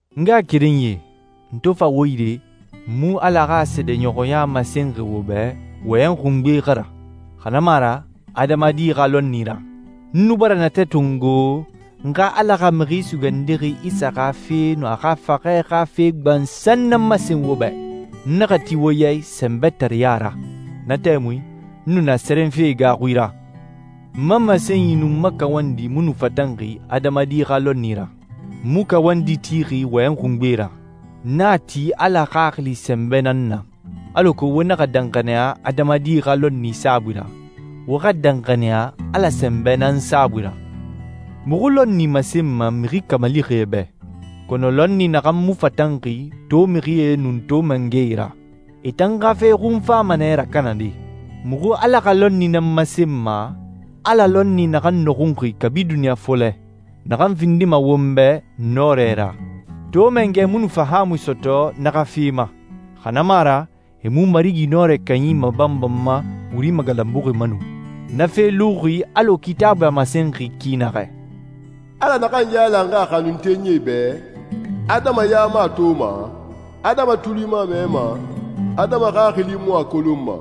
N ngaxakerenyie, n to fa wo yire, n mu Ala xa seedeɲɔxɔya masenxi wo bɛ wɔyɛnyi xungbee xa ra, xa na mu a ra adamadi xa lɔnni ra. N nu bara natɛ tongo n xa Ala xa Mixi Sugandixi Isa xa fe nun a xa faxɛ xa fe gbansan nan masen wo bɛ. N naxa ti wo ya i sɛnbɛtareya ra. Na tɛmui n nu na sɛrɛnfe gaaxui ra. N ma masenyi nun n ma kawandi mu nu fatanxi adamadi xa lɔnni ra. N mu kawandi tixi wɔyɛnyi xungbee ra. N na ti Ala Xaxili sɛnbɛ nan na, alako wo naxa danxaniya adamadi xa lɔnni saabui ra, wo xa danxaniya Ala sɛnbɛ nan saabui ra. Muxu lɔnni masenma mixi kamalixie bɛ, kɔnɔ lɔnni naxan mu fatanxi to mixie nun to mangɛe ra. E tan xa fe xun fama nɛ rakanade. Muxu Ala xa lɔnni nan masenma, Ala lɔnni naxan nɔxunxi kabi duniɲa fɔlɛ, naxan findima won bɛ nɔrɛ ra. To mangɛe mu nu fahaamui sɔtɔ na xa fe ma, xa na mu a ra e mu Marigi Nɔrɛ Kanyi mabanbanma wuri magalanbuxi ma nu. Na fe luxi alɔ Kitaabui a masenxi ki naxɛ, «Ala naxan yailanxi a xanuntenyie bɛ, adama ya mu a toma, adama tuli mu a mɛma, adama xaxili mu a kolonma.»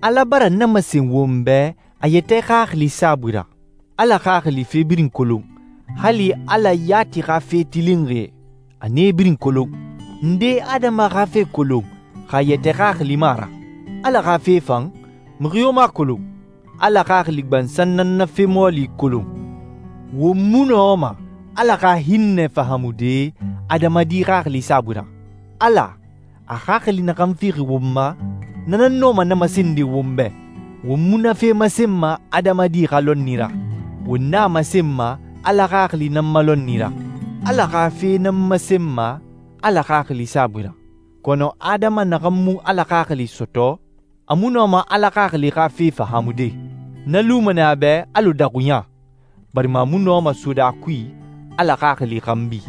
Ala bara na masen won bɛ a yɛtɛ Xaxili saabui ra. Ala Xaxili fe birin kolon, hali Ala yati xa fe tilinxie. A nee birin kolon. Nde adama xa fe kolon, xa a yɛtɛ xaxili mu a ra? Ala xa fe fan, mixi yo mu a kolon. Ala Xaxili gbansan nan na fe mɔɔli kolon. Won mu nɔma Ala xa hinnɛ fahaamude adamadi xaxili saabui ra. Ala, a Xaxili naxan fixi won ma, na nan nɔma na masende won bɛ. Won mu na fe masenma adamadi xa lɔnni ra, won na masenma Ala Xaxili nan ma lɔnni ra. Ala xa fe nan masenma Ala Xaxili saabui ra. Kɔnɔ adama naxan mu Ala Xaxili sɔtɔ, a mu nɔma Ala Xaxili xa fe fahaamude. Na luma nɛ a bɛ alɔ daxuɲa, barima a mu nɔma sode a kui Ala Xaxili xanbi.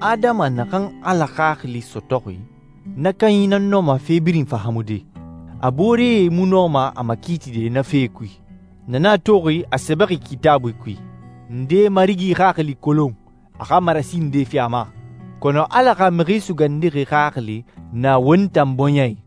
Adama naxan Ala Xaxili sɔtɔxi, na kanyi nan nɔma fe birin fahaamude. A booree mu nɔma a makiitide na fee kui. Na nan a toxi a sɛbɛxi Kitaabui kui, «Nde Marigi Xaxili kolon, a xa marasi nde fi a ma?» Kɔnɔ Ala xa Mixi Sugandixi Xaxili na won tan bɔɲɛ i.